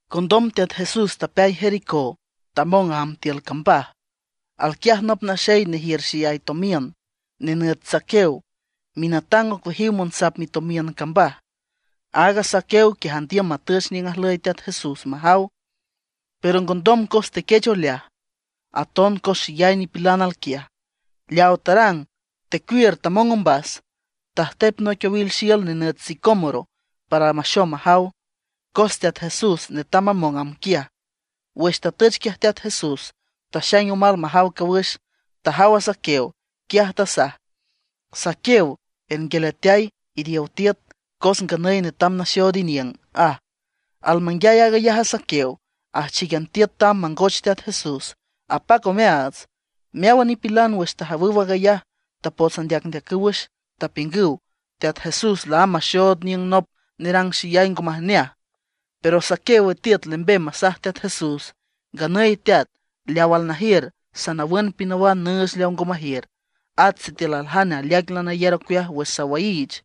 Condom Teat Jesús tapeay Jericó, tamong amb tiül cambaj. Alquiaj nop naxey nejiür xeyay tomiün, nenüt Zaqueo, minatang ocueajiw monsap mitomiün cambaj. Aaga Zaqueo quiaj andiüm matüch niüng ajlüy Teat Jesús majaw. Pero ngondom cos tequech oleaj, aton cos xeyay nipilan alquiaj. Leawa tarang, tecuiür tamong ombas, tajtep noic owil xiül nenüt sicómoro para maxom majaw, cos Teat Jesús netam mamong amb quiaj. Wüx tatüch quiaj Teat Jesús, taxaing omal majaw cawüx. Tajaw a Zaqueo, quiaj tasaj: ―¡Zaqueo! ¡Ernguialeateay, iriow tiüt! Cos nganüy netam naxood iniüng ―aj. Almanguiay aag ayaj a Zaqueo, ajchícan tiüt tamb mangoch Teat Jesús, apac omeaats. Meáwan nipilan wüx tajawüw aag ayaj tapots andeacndeacüw wüx. Tapiüngüw Teat Jesús laámb maxood aniüng nop nerang xeyay ngo majneaj. Pero Zaqueo witiüt lembem masaj Teat Jesús: ―Nganüy Teat, leaw alnajiür sanawün pinawan nüüch leawa ngo majiür; at sitiül aljane aleaic lanayar ocueaj wüx sawaiich,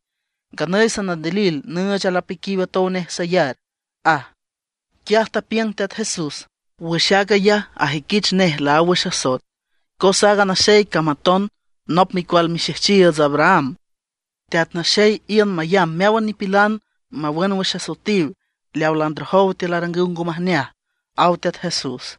nganüy sanandilil nüüch alapiquiw atow nej sayar ―aj. Quiaj tapiüng Teat Jesús: ―Wüx aag ayaj ajüiquich nej laáw wüx asoet, cos aaga naxey cam aton nop micual mixejchiiüts Abraham. Teat Naxey iün mayamb meáwan nipilan mawün wüx asoetiw leawa landrojow tiül arangüw ngo majneaj ―aw Teat Jesús.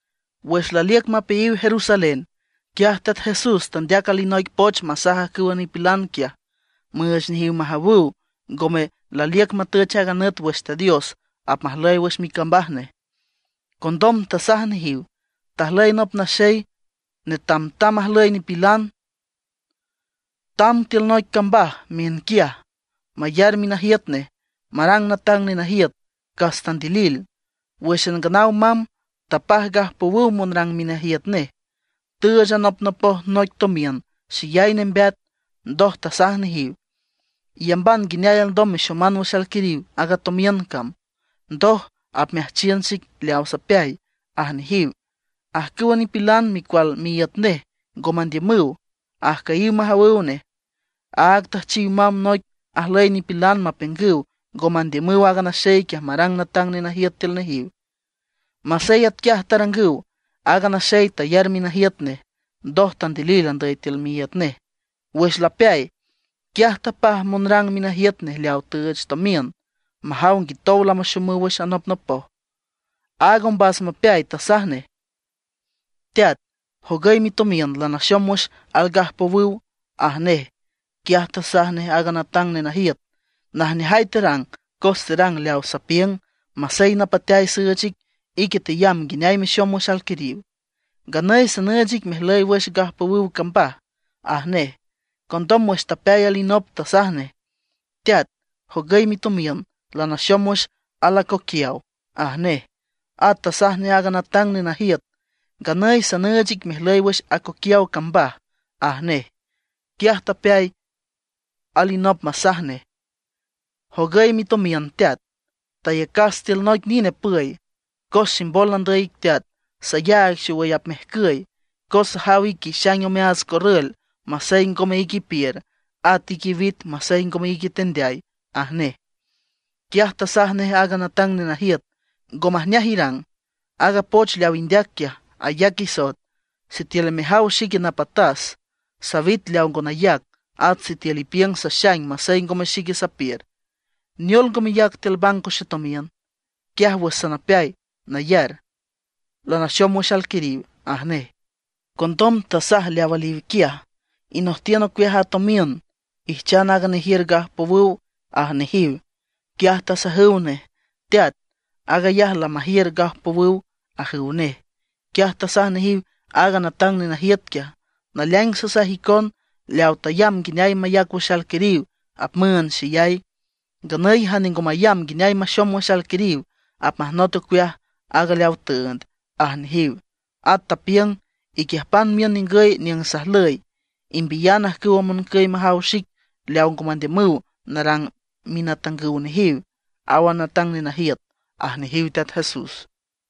Wüx laliüc mapeayiw Jerusalén, quiaj Teat Jesús tandeac alinoic poch masaj ajcüwa nipilan quiaj müüch nejiw majawüw ngome laliüc matüch aaga nüt wüx Teat Dios apmajlüy wüx micambaj nej. Condom tasaj nejiw: ―Tajlüy nop naxey netamtam ajlüy nipilan, tamb tiül noic cambaj miünquiaj mayar minajiüt nej marang natang nenajiüt, cas tandilil. Wǘxan nganaw mamb, tapaj gajpowüw monrang minajiüt nej. Tüüch anopnopoj noic tomiün xeyay nembeat, ndoj tasaj nejiw: “Iyamban nguineay alndom mexoman wüx alquiriw aaga tomiün cam, ndoj apmeajchiün xic leaw sapeay”, aj nejiw. Ajcüwa nipilan micual miíüt nej ngo mandiümüw, ajcüyiw majawüw nej. Áag tüjchiw mamb noic ajlüy nipilan mapiüngüw ngo mandiümüw aaga naxey quiaj marang natang nenajiüt tiül nejiw. Masey atquiaj tarangüw, aaga naxey tayar minajiüt nej. Ndoj tandilil andüy tiül miíüt nej. Wüx lapeay, quiaj tapaj monrang minajiüt nej leawa tüüch tomiün, majaw nguitow lamaxomüw wüx anopnopoj. Aaga ombas mapeay tasaj nej: “Teat, jogüy mitomiün, lanaxom wüx algajpowüw”, aj nej. Quiaj tasaj nej aaga natang nenajiüt: “Najneajay terang cos terang leaw sapiüng; masey napateay süüch ic, ique teyamb nguineay mexom wüx alquiriw. Nganüy sanüüch ic mejlüy wüx gajpowüw cambaj”, aj nej. Condom wüx tapeay alinop tasaj nej: “Teat, jogüy mitomiün, lanaxom wüx alacoquiaw”, aj nej. At tasaj nej aaga natang nenajiüt: “Nganüy sanüüch ic mejlüy wüx acoquiaw cambaj”, aj nej. Quiaj tapeay alinop masaj nej: “Jogüy mitomiün, teat. Tayacas tiül noic nine püy. Cos ximbol nandüy ic teat, sayaag xowüy apmejcüy. Cos sajaw ique ixaing omeaats corrül masey ngome ique ipiür, at ique iwit masey ngome ique itendeay”, aj nej. Quiaj tasaj nej aaga natang nenajiüt: “Ngo majneaj irang, aaga poch leaw indeac quiaj ayac isoet. Sitiül lamejaw xique napatas, sawit leaw ngo nayac, at sitiül ipiüng saxaing masey ngome xique sapiür; ¿neol ngo meyac tiül banco xetomiün? Quiaj wüx sanapeay nayar, lamaxom wüx alquiriw”, aj nej. Condom tasaj leaw aliw quiaj: “Inojtiün ocueaj a tomiün; ijchan aaga nejiür gajpowüw”, aj nejiw. Quiaj tasajüw nej: “¡Teat, aag ayaj lamajiür gajpowüw!”, ajüw nej. Quiaj tasaj nejiw aaga natang nenajiüt quiaj: “Naleaing sasaj icon, leawa tayamb nguineay mayac wüx alquiriw, apmüünd xeyay; nganüy jane ngo mayamb nguineay maxom wüx alquiriw, apmajnot ocueaj aaga leawa tüünd”, aj nejiw. At tapiüng: “Iquiüjpan miün ningüy niüng sajlüy; imbiyan ajcüwa moncüy majaw xic leaw ngo mandiümüw narang minatangüw nejiw”, aw a natang nenajiüt ―aj nejiw Teat Jesús.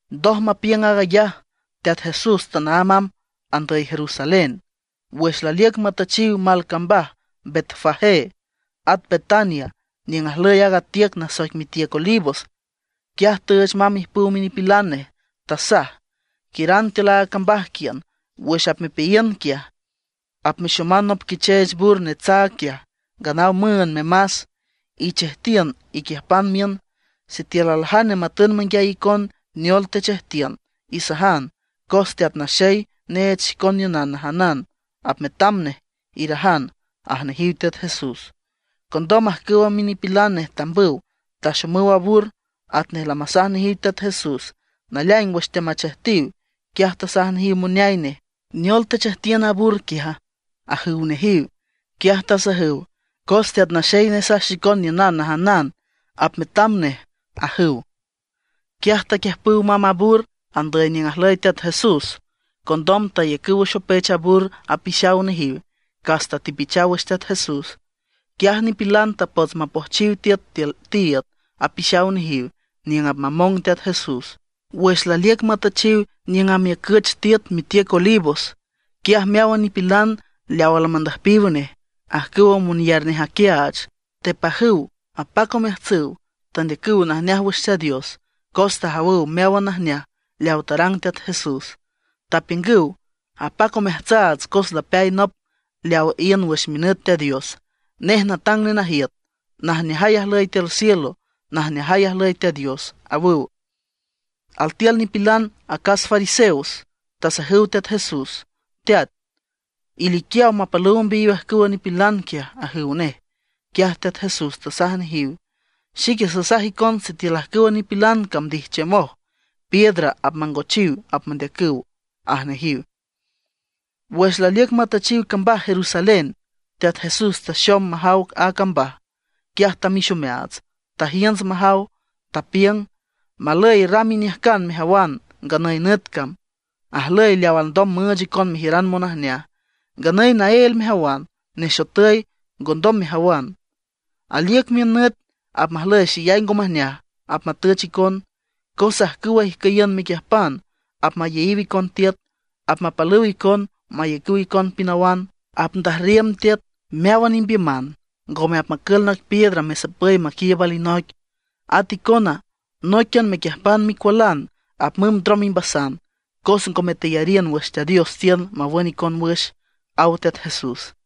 Ndoj mapiüng aag ayaj, Teat Jesús tanaámb tamb andüy Jerusalén. Wüx laliüc matüchiw mal cambaj Betfagé, at Betania, niüng ajlüy aaga tiüc nasoic mitiüc Olivos, quiaj tüüch mamb ijpüw minipilan nej. Tasaj: ―Quiüran tiül aaga cambaj quiün. Wüx apmepeayiün quiaj, apmexoman nop quicheech bur netsaag quiaj, nganaw müünd memas. Ichejtiün iquiüjpan miün. Sitiül aljane matün manguiay icon neol techejtiün, isajan: “Cos Teat Naxey neech xicon niünan najanan apmetam nej”, irajan ―aj nejiw Teat Jesús. Condom ajcüwa minipilan nej tambüw, taxomüw a bur atnej lamasaj nejiw Teat Jesús. Naleaing wüx teamachejtiw, quiaj tasaj nejiw moneay nej: ―¿Neol techejtiün a bur quiaja? ―ajüw nejiw. Quiaj tasajüw: ―Cos Teat Naxey nesaj xicon niünan najanan, apmetam nej ―ajüw. Quiaj taquiüjpüw mamb a bur andüy niüng ajlüy Teat Jesús. Condom tayacüw wüx opech a bur apixaw nejiw, cas tatepichaw wüx Teat Jesús. Quiaj nipilan tapots mapojchiw tiüt tiül tiiüd apixaw nejiw niüng apmamong Teat Jesús. Wüx laliüc matüchiw niüng amiücüch tiüt mitiüc Olivos, quiaj meáwan nipilan leaw almandüjpiw nej, ajcüwa monyar nej aquiaach, tepajüw apac omeajtsüw, tandeacüw najneaj wüx Teat Dios cos tajawüw meáwan najneaj leawa tarang Teat Jesús. Tapiüngüw: ―¡Apac omeajtsaats cos lapeay nop leaw iün wüx minüt Teat Dios! ¡Nej natang nenajiüt! ¡Najneajay ajlüy tiül cielo; najneajay ajlüy Teat Dios! ―awüw. Altiül nipilan acas fariseos, tasajüw Teat Jesús: ―Teat, iliquiaw mapalüw ombeayiw ajcüwa minipilan quiaj ―ajüw nej. Quiaj Teat Jesús tasaj nejiw: ―Xique sasaj icon sitiül ajcüwa nipilan cam ndijchiümoj, piedra apmangochiw apmendeacüw ―aj nejiw. Wüx laliüc matüchiw cambaj Jerusalén, Teat Jesús taxom majaw a cambaj, quiaj tamix omeaats, tajiünts majaw. Tapiüng: ―¡Malüy ram iniüjcan mejawan nganüy nüt cam, ajlüy leaw alndom müüch icon mejiüran monajneaj! Nganüy naél mejawan, nexotüy, ngondom mejawan. Aliüc miün nüt apmajlüy xeyay ngo majneaj apmatüch icon. Cos ajcüwa ijcüyiün mequiüjpan apmayeyiw icon tiüt; apmapalüw icon mayacüw icon pinawan. Apndajrriüm tiüt meáwan imbiüman, ngome apmacül noic piedra mesapüy maquiiüb alinoic. At icona nóiquian mequiüjpan micualan apmümb ndrom imbasan, cos ngome teyariün wüx Teat Dios tiün mawün icon wüx ―aw Teat Jesús.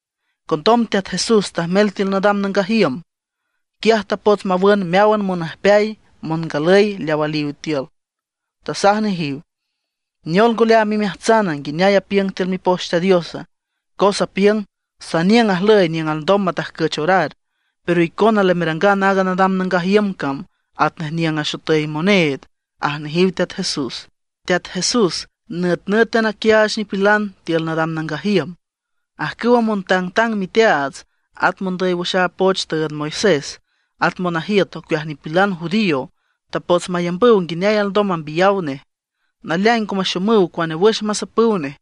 Condom Teat Jesús tajmel tiül nadam nangaj iüm, quiaj tapots mawün meáwan monüjpeay, mongalüy leaw aliw tiül. Tasaj nejiw: ―¿Neol ngo leaam imeajtsana nguineay apiüng tiül Mipoch Teat Diosa? Cos apiüng: “Saniüng ajlüy niüng alndom matajcüch orar”; pero icona lamerangan aaga nadam nangaj iüm cam atnej niüng axotüy moneed ―aj nejiw Teat Jesús. Teat Jesús nütnǘtan aquiaach nipilan tiül nadam nangaj iüm. Ajcüwa montangtang miteaats, at mondüy wüx aaga poch tüünd Moisés, at monajiüt ocueaj nipilan judío, tapots mayambüw nguineay alndom mambiyaw nej. Naleaing ngo maxomüw cuane wüx masapüw nej,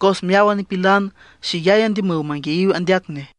cos meáwan nipilan xeyay andiümüw manguiayiw andeac nej.